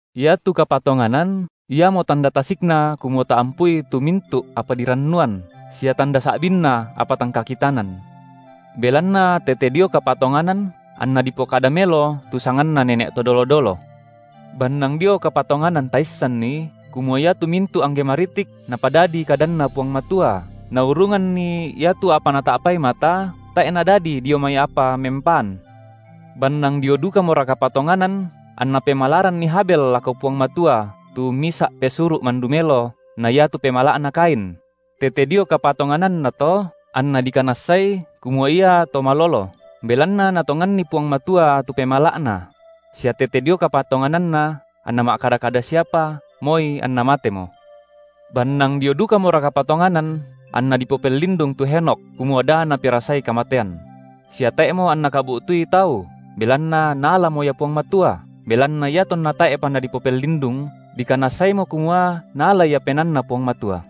Iatu kapatonganan iamo tanda tasikna kumua taampui tu mintu’ apa dirannuan, sia tanda sa’binna apa tang kakitanan. Belanna tete dio kapatonganan anna dipokada melo tu sanganna nene’ to dolo-dolo. Bannang dio kapatonganan taissanni, kumua iatu mintu’ angge maritik Napadadi kadanNa Puang Matua, naurunganni iatu apa nata’pai mata, tae’ nadadi dio mai apa mempaan. Bannang dio dukamora kapatonganan anna pemalaranni Habel lako Puang Matua tu misa’ pesuru’ mandu melo na iatu pemala’na Kain; tete dio kapatongananna to, anna dikanassai, kumua iato malolo, belanna Natonganni Puang Matua tu pemala’na; sia tete dio kapatongananna anna ma’kada-kada siapa, moi anna matemo. Bannang dio dukamora kapatonganan anna dipopellindung tu Henokh, kumua da naperasai kamatean; sia tae’mo anna kabu’tui tau, belanna Naalamo ia Puang Matua, belanna iatonna tae’pa nadipopellindung dikanassaimo kumua Naala ia penaanNa Puang Matua.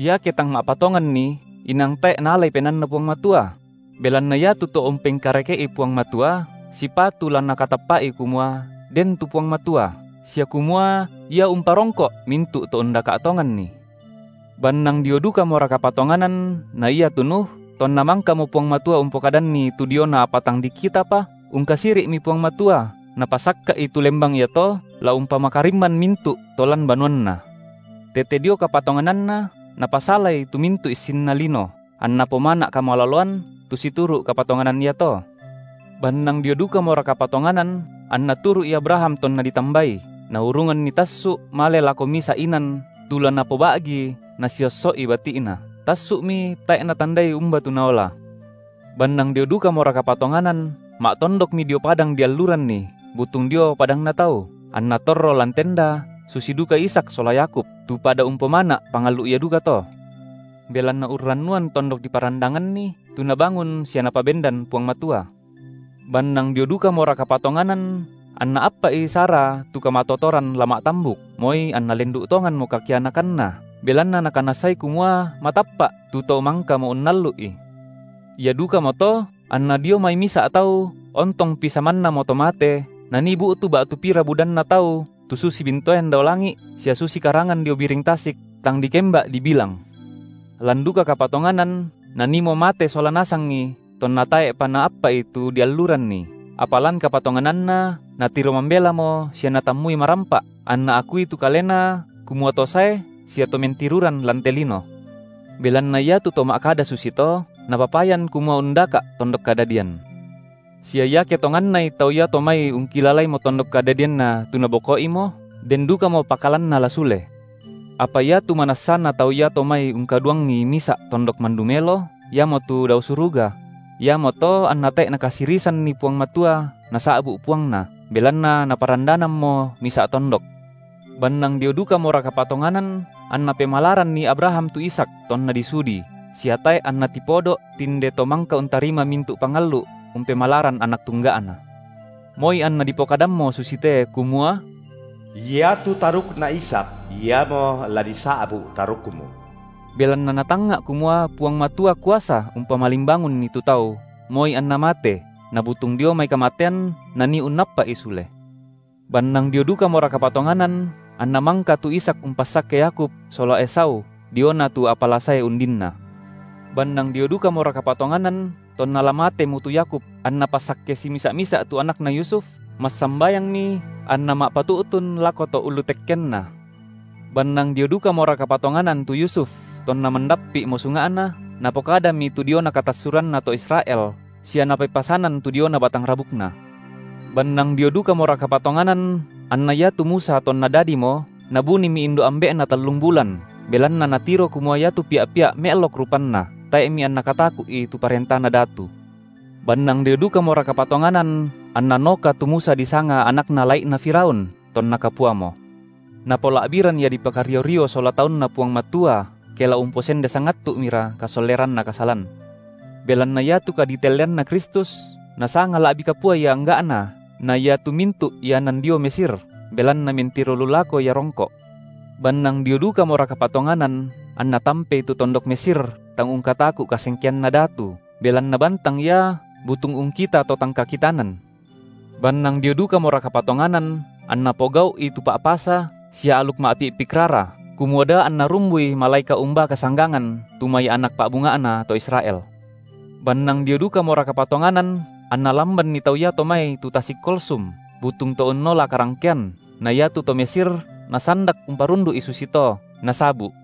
Iake tang ma’patonganni inang tae’ naalai penaanNa Puang Matua; belanna iatu to umpengkareke’i Puang Matua sipatu la nakatappa’i kumua den tu Puang Matua, sia kumua Ia umparongko’ mintu’ to undaka’ tonganNi. Bannang dio dukamora kapatonganan na iatu Nuh, tonna mangkamo Puang Matua umpokadanni tu diona apa tang dikitapa, ungkasiri’mi Puang Matua napasakka’i tu lembang iato la umpamakarimman mintu’ to lan banuanna; tete dio kapatongananna napasalai tu mintu’ issinna lino, anna pomana’ kamaloloan tu situru’ kapatonganan iato. Bannang dio dukamora kapatonganan, anna turu’i Abraham tonna ditambai, naurunganni tassu’ male lako misa’ inan tu la napoba’gi nasiosso’i bati’na; tassu’mi tae’ natandai umba tu naola. Bannang dio dukamora kapatonganan, ma’tondokmi dio padang dialluranni butung dio padangna tau, anna torro lan tenda, susi duka Ishak sola Yakub, tu pada umpomana’ pangallu’ ia dukato. Belanna urrannuan tondok diparandanganni, tu Nabangun sia Napabendan Puang Matua. Bannang dio dukamora kapatonganan anna appa’i Sara tu kamatotoran la ma’tambuk, moi anna lendu’ tonganmo kakianakanna, belanna nakanassai kumua matappa’ tu To-mangkamo unnallu’i. Ia dukamoto, anna dio mai misa’ tau, ontongpi samannamo to mate, nanii bu’tu ba’tu pira budanna tau tu susi bintoen dao langi’ sia susi karangan dio biring tasik tang dikemba’ dibilang. Lan duka kapatonganan naniimo mate sola nasangi tonna tae’pa naappa’i tu apa dialluranni, apa lan kapatongananna natiro mambelamo sia natammui marampa’, anna akui tu kalena kumua to sae sia to mentiruran lan te lino. Belanna iatu to ma’kada susito, napapayan kumua undaka’ tondok kadadian. Sia iake tongannai tau iato mai ungkilalaimo tondok kadadianna tu naboko’imo, den dukamo pakalanna la sule. Apa iatu manassana tau iato mai ungkaduangi misa’ tondok mandu melo, iamotu dao suruga; iamoto anna tae’ Nakasirisanni Puang Matua nasa’bu’ Puangna, belanna Naparandanammo misa’ tondok. Bannang dio dukamora kapatonganan anna pemalaranni Abraham tu Ishak, tonna disudi, sia tae’ anna tipodo’ tinde to mangka untarima mintu’ pangallu’ umpemalaran anak tungga’na, moi anna dipokadammo susite, kumua: Iatu tarukna Ishak iamo la disa’bu’ tarukmu. Belanna natangnga’ kumua Puang Matua kuasa umpamalimbangunni tu tau, moi anna mate; nabutung dio mai kamatean nanii unnappa’i sule. Bannang dio dukamora kapatonganan anna mangka tu Ishak umpassakke Yakub, sola Esau diona tu apa la sae undinna. Bannang dio dukamora kapatonganan tonna la matemo tu Yakub anna passakke simisa’-misa’ tu anakna Yusuf, massambayangmi anna ma’patu’tun lako to’ ulu tekkenna. Bannang dio dukamora kapatonganan tu Yusuf tonna mandappi’ mo sunga’na, napokadami tu diona katassuranna to Israel, sia napepasanan tu diona batang rabukna. Bannang dio dukamora kapatonganan anna iatu Musa tonna dadimo, nabunimi indo’ ambe’na tallung bulan, belanna natiro kumua iatu pia’-pia’ me’lok rupanna, tae’mi anna kataku’i tu parentana datu. Bannang dio dukamora kapatonganan anna noka tu Musa disanga anakna Lai’na Firaun, tonna kapuamo; napola’biran ia dipakario-rio sola taunNa Puang Matua, ke la umposende sangattu’mira kasolleranna kasalan; belanna iatu kaditelleanNa Kristus nasanga la’bi kapua ia angga’na na iatu mintu’ ianan dio Mesir, belanna mentiro lu lako ia rongko’. Bannang dio dukamora kapatonganan anna tampei tu tondok Mesir tang ungkataku’ kasengkeanna datu, belanna bantang ia butung ungkita To tang kakitanan. Bannang dio dukamora kapatonganan anna pogau’i tu Pa’pasa sia aluk ma’pi’pik rara, kumua da anna rumbui malaeka’ umbaa kasanggangan tu mai anak pa’bunga’na to Israel. Bannang dio dukamora kapatonganan anna lambanni tau iato mai tu tasik Kolsum, butung to unnola karangkean; na iatu to Mesir nasandak umparundu’i susito, nasabu’.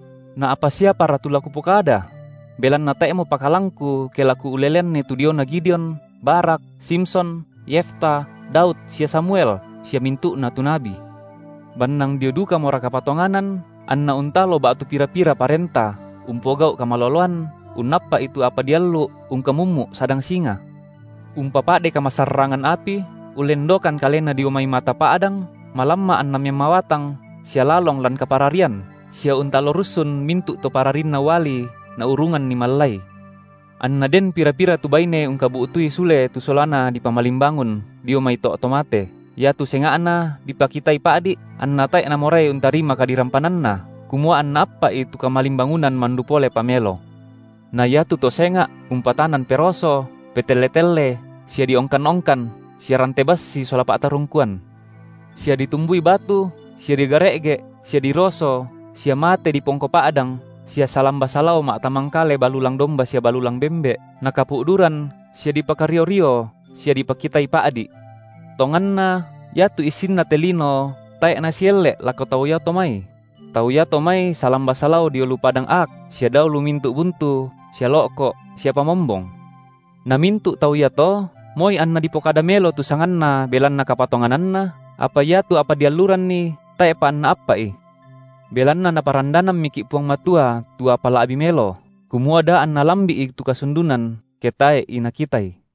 Na apa siapara tu la kupokada? Belanna tae’mo pakalangku ke la kuuleleanni tu diona Gideon, Barak, Simson, Yefta, Daud sia Samuel, sia mintu’na tu nabi. Bannang dio dukamora kapatonganan anna untalo ba’tu pira-pira parenta, umpogau’ kamaloloan, unnappa’i tu apa diallu’, ungkamummu’ sadang singa, umpapa’de kamasarrangan api, ullendokan kalena dio mai mata pa’dang, malamma’ anna memmawatang, sia lalong lan kapararian, sia untalo russun mintu’ to pararinna uali naurunganni mallai. Anna den pira-pira tu baine ungkabu’tui sule tu solana dipamalimbangun dio mai to’ to mate, iatu senga’na dipakitai pa’di’, anna tae’ namorai untarima kadirampananna, kumua anna appa’i tu kamalimbangunan mandu polepa melo. Na iatu to senga’ umpatanan peroso, petelle-telle, sia diongkan-ongkan, sia rante bassi sola pa’tarungkuan. Sia ditumbui batu, sia digare’ge’, sia diroso, sia mate dipongko pa’dang, sia salamba-salao ma’tamangkale balulang domba sia balulang bembe’, nakapu’duran sia dipakario-rio sia dipakitai pa’di’. Tonganna iatu issinna te lino tae’ nasielle’ lako tau iato mai; tau iato mai salamba salao dio lu padang aak sia dao lu mintu’ buntu sia lo’ko’ sia pamombong. Na mintu’ tau iato, moi anna dipokada melo tu sanganna belanna kapatongananna, apa iatu apa dialluranni tae’pa anna appa’i. Belanna Naparandanammiki’ Puang Matua tu apa la’bi’ melo, kumua da anna lambi’i tu kasundunan ke tae’i nakitai.